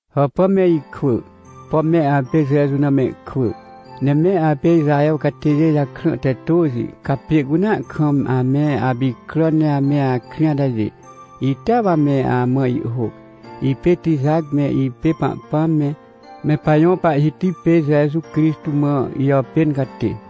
Hàpà me ikwỳ! Pom me apê Jeju na mehkwỳ, ne me apê Ixaher catêjê jakrã te tôxi, ca pjê cunea kam ame apicràn ne ame akrĩ atajê, itea wa me amã ihhôc. Ipê Tijac, ne ipê Pahpãm me, me pajõ Pahhiti pê Jeju Crixtô mã ijàpên catê.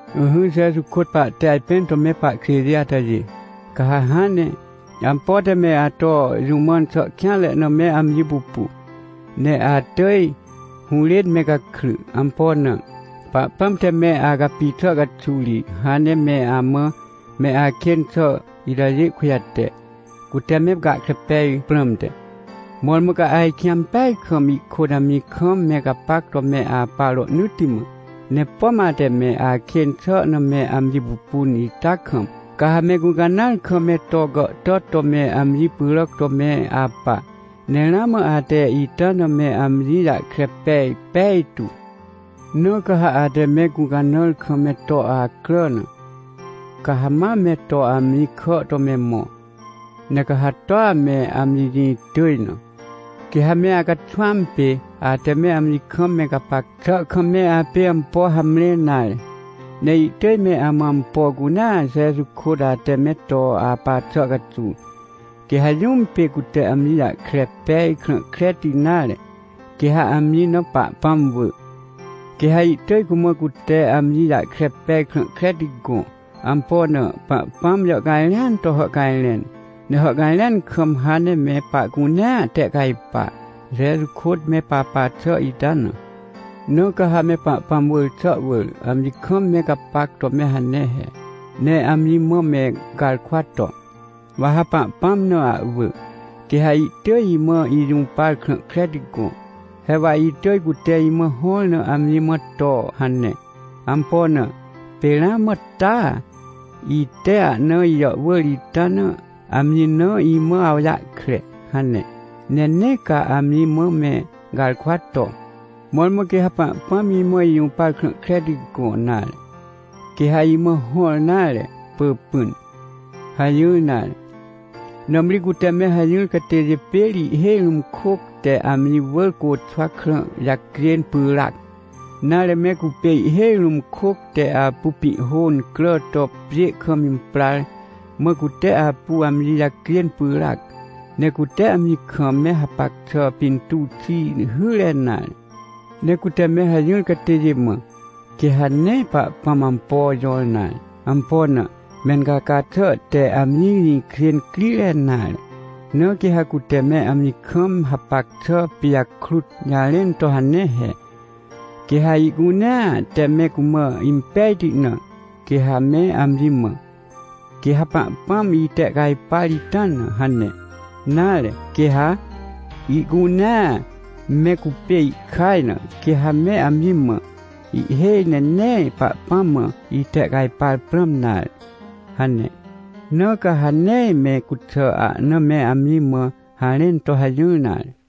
Ỹhỹ, Jeju kôt pahte ajpẽn to me pahkjêjê atajê, ca ha hãn ne, ampo te me ato jũ mãn xà kêanre na me amji pupu, ne atỳj hũrên me gakry. Ampo na? Pahpãm te me acapi xà caxuw ri hãn ne me amã me akên xà itajê kujate, cute me gahkre peaj prãmte, mõrmõ ca ajkĩ ampeaj kam ihkôt amji kam me gapac to me apa rohnỳtti mã. Ne pom ate me akên xà na me amji pupun ita kam, ca ha me gũcanãar kam me to gàhtàt to me amji pyràc to me apa. Ne ramã ate ita na me amji jahkre pej pejtu. Na ca ha ate me gũcanãr kam me to acrà na, ca ha ma me to amji kà to me mõ. Ne ca ha toa me amji jĩ tỳj na, quê ha me acaxwãm pê ate me amji kam me gapac xà kam me apê ampo hamre nare, ne ihtỳj me amã ampo cunea Jeju kôt ate me to apa xà caxuw. Quê ha jũm pê cute amji jahkre pej krã kreti nare, quê ha amji na Pahpãm wỳ, quê ha ihtỳj cumã cute amji jahkre pej krã kreti gõ. Ampo na? Pahpãm jàhcajrẽan to hàhcajrẽn, ne hàhcajrẽan kam hãn ne me pahcunea tehcajpa, Jeju kôt me papa xà ita na. Na ca ha me Pahpãm wỳr xà wỳr, amji kam me gapac to me hane he, ne amji mã me garkwa to: — Wa ha Pahpãm na ahwỳ, quê ha ihtỳj imã ijũpar krã kreti gõ. He wa itỳj cute imã hõr na amji mã to hane. Ampo na? Pê ramã taa, ite ahna ijàhwỳr ita na, amji na imã awjahkre — hane. Ne nee ca amji mã me garkwa to: — Mõrmõ quê ha Pahpãm imã ijũpar krã kreti gõ, nare, quê ha imã hõr nare, pỳpỹn — hajỹr nare. Nãmri cute me hajỹr catêjê pê ri ihhêj rũm kôc te amji wỳr côxwa krã jacjên pyràac, nare, me cupê ihhêj rũm kôc te apu pĩhhô incrà to pjê kam imprar, mã cute apu amji jacjên pyràac. Ne cute amji kam me hapac xà pintuw xi hyre nare. Ne cute me hajỹr catêjê mã, quê ha nee Pahpãm ampo jõr nare. Ampo na? Mencaca xà te amji jĩkjê incrire nare. Na quê ha cute me amji kam hapac xà pijakrut jarẽn to hane he. Quê ha ihcunea te me cumã impejti na, quê ha me amji mã: — Quê ha Pahpãm itehcajpar ita na — hane. Nare, quê ha ihcunea me cupê ihkaj na, quê ha me amji mã: — Ihhêj ne nee Pahpãm mã itehcajpar prãm nare — hane. Na ca ha nee me cuxà ahna me amji mã harẽn to hajỹr nare.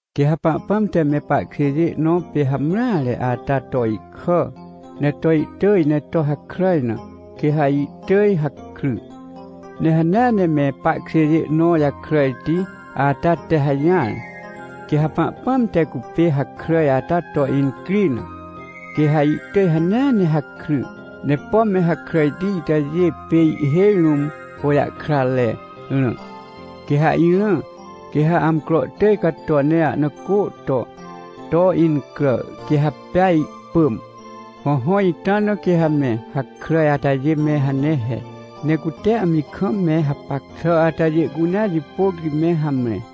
Quê ha Pahpãm te me pahkjêjê nõ pê hamreare ata to ihkà, ne to ihtỳj ne to hakràj na, quê ha ihtỳj hakry. Ne hanea ne me pahkjêjê nõ jakràjti ata te hajỹar, quê ha Pahpãm te cupê hakràj ata to incri na, quê ha ihtỳj hanea ne hakry. Ne pom me hakràjti itajê pê ihhêj rũm hôjahkratre rã. Quê ha irã, quê ha amcro tỳj cato ne ahna cô to, to incrà, quê ha pea ihpỳm. Hõhõ, ita na quê ha me hakràj atajê me hane he, ne cute amji kam me hapac xà atajê cunea jipôc ri me hamre.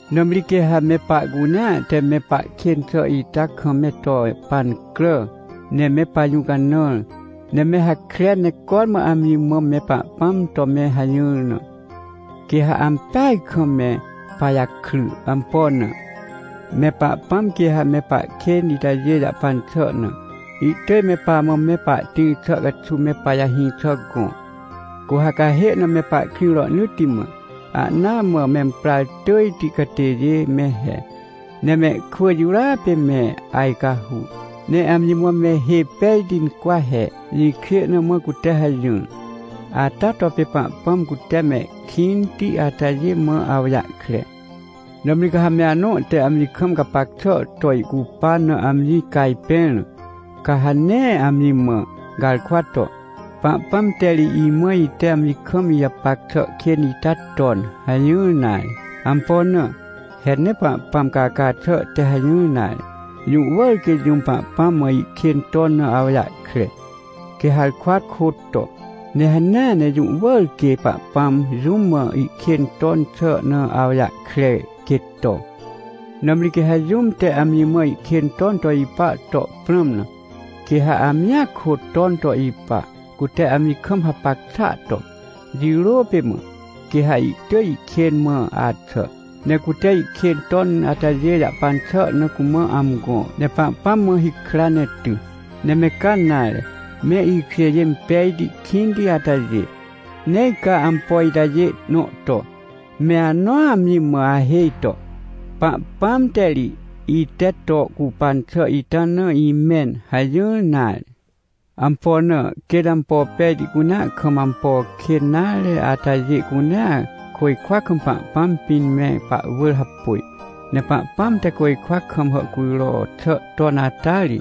Nãmri quê ha me pahcunea te me pahkên xà ita kam me to pancrà, ne me pajũcanãr, ne me hakren, ne cormã amji mã me Pahpãm to me hajỹr na, quê ha ampeaj kam me pajakry. Ampo na? Me Pahpãm quê ha me pahkên itajê jahpan xà na, ihtỳj me pamã me pahtĩr xà caxuw me pajahĩ xà gõ, cu ha cahê na me pahkrĩ rohnỳtti mã. Ahnaa mã memprar tỳjti catêjê me he. Ne mehkwỳ jirôa pê me ajcahu, ne amji mã me hê pejti incwa he. Jĩkjê na mã cute hajỹr. Ata to pê Pahpãm cute mehkĩnti atajê mã awjahkre. Nãmri, ca ha me anõ te amji kam gapac xà to ihcupan na amji cajpẽr na, ca ha nee amji mã garkwa to: — Pahpãm te ri imã ite amji kam ijapac xà kên ita ton — hajỹr nare. Ampo na? He nee Pahpãm caca xà te hajỹr nare. Jũ wỳr quê jũm Pahpãm mã ihkên ton na awjahkre, quê harkwa kôt to. Ne hanea ne jũ wỳr quê Pahpãm jũm mã ihkên ton xà na awjahkre, quê to. Nãmri quê ha jũm te amji mã ihkên ton to ipa to prãm na, quê ha amjia kôt ton to ipa, cute amji kam hapac xàa to. Jirô pê mã, quê ha ihtỳj ihkên mã axà, ne cute ihkên ton atajê jahpan xà na cumã amgõ, ne Pahpãm mã hikra ne ty. Ne me ca nare, me ikjêjê impejti kĩnti atajê, nee ca ampo itajê nõ to, me anõa amji mã ahêj to: — Pahpãm te ri, ite to ihcupan xà ita na imẽn — hajỹr nare. Ampo na? Quêt ampo pejti cunea kam ihkên nare atajê cunea, côjkwa kam Pahpãm pĩn me pahwỳr hapôj. Ne Pahpãm te côjkwa kam hàhcujro xà ton ata ri,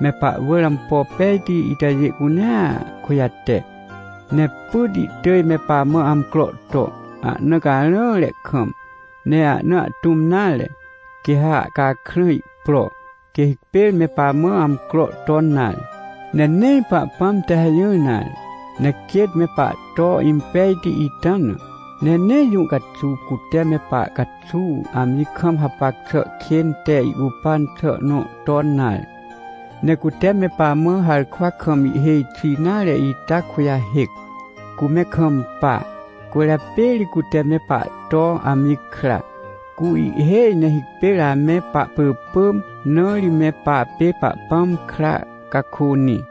me pahwỳr ampo pejti itajê cunea kujate. Ne pyt ihtỳj me pamã amcro to, ahna carãre kam. Ne ahna ahtũm nare, quê ha ahcakrã ihpro, quê hipêr me pamã amcro ton nare. Ne nee Pahpãm te hajỹr nare, ne quêt me pahto impejti ita na, ne nee jũ caxuw cute me pahcaxuw amji kam hapac xà kên te ihcupan xà nõ ton nare. Ne cute me pamã harkwa kam ihhêj xi nare ita kujahêc. Cu me kampa, cwỳrjapê ri cute me pahto amji kra. Cu ihhêj ne hipêr ame pahpỳpỳm, na ri me papê Pahpãm kra cakônĩ.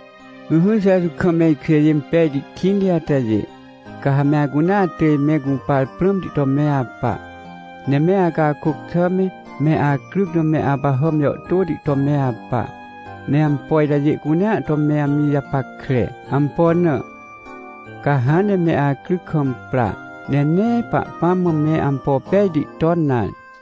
Ỹhỹ, Jeju kam me ikjêjê impejti kĩnti atajê, ca ha me acunea atỳj me gũpar prãmti to me apa, ne me acakôc xà me, me acryc na me apahàm jàhtôti to me apa, ne ampo itajê cunea to me amji japackre. Ampo na? Ca hãn ne me acryc kam pra, ne nee Pahpãm mã me ampo pejti ton nare.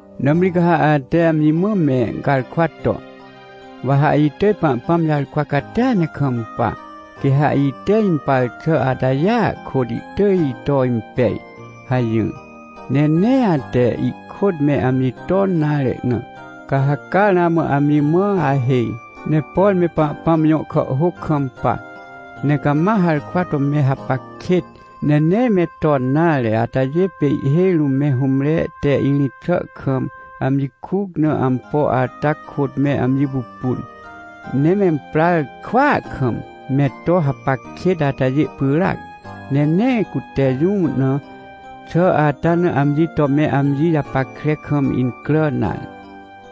Nãmri ca ha ate amji mã me garkwa to: — Wa ha itỳj Pahpãm jarkwa catia ne kampa, quê ha ite impar xà atajêa kôt ihtỳj ito impej — hajỹr, ne nee ate ihkôt me amji ton nare na, ca ha caa ramã amji mã ahêj. Ne por me Pahpãm jõ kàhhôc kampa, ne cama harkwa to me hapac kêt, ne nee me ton nare atajê pê ihhêj rũm me hũmre te irĩt xà kam amji kuc na ampo ata kôt me amji pupun, ne memprar kwaa kam me to hapac kêt atajê pyràac. Ne nee cute jũ na xà ata na amji to me amji japackre kam incrà nare.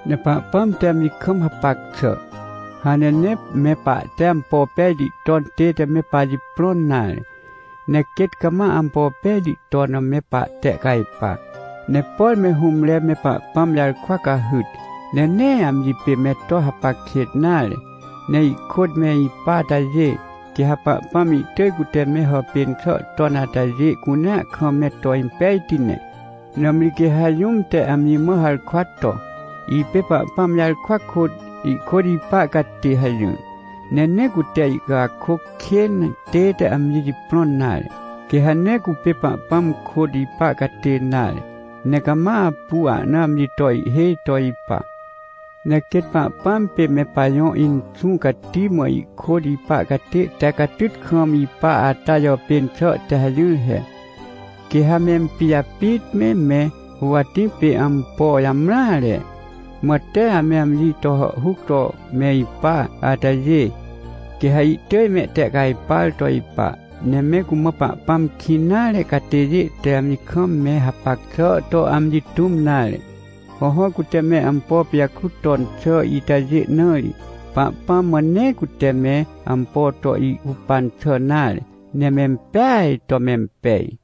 Ne Pahpãm te amji kam hapac xà, hãn ne nee me pahte ampo pejti ton tête me pajiprõn nare, ne quêt cama ampo pejti ton na me pahtehcajpa. Ne por me hũmre me Pahpãm jarkwa cahyt, ne nee amji pê me to hapac kêt nare, ne ihkôt me ipa atajê, quê ha Pahpãm ihtỳj cute me hàpên xà ton atajê cunea kam me to impejti ne. Nãmri quê ha jũm te amji mã harkwa to: — Ipê Pahpãm jarkwa kôt, ihkôt ipa catê — hajỹr, ne nee cute ihcakôc kên tête amji jiprõn nare, quê ha nee cupê Pahpãm kôt ipa catê nare, ne cama apu ahna amji to ihhêj to ipa. Ne quêt Pahpãm pê me pajõ Inxũ Cati mã ihkôt ipa catê te catyt kam ipa ata jàpên xà te hajỹr he. Quê ha mempijapit me, me huwatĩ pê ampo jamreare, mã tee ame amji to hàhhuc to me ipa atajê, quê ha ihtỳj mehtehcajpar to ipa. Ne me cumã Pahpãm kĩn nare catêjê te amji kam me hapac xà to amji tũm nare. Hõhõ, cute me ampo pijakrut ton xà itajê na ri, Pahpãm mã nee cute me ampo to ihcupan xà nare, ne mempeaj to mempej.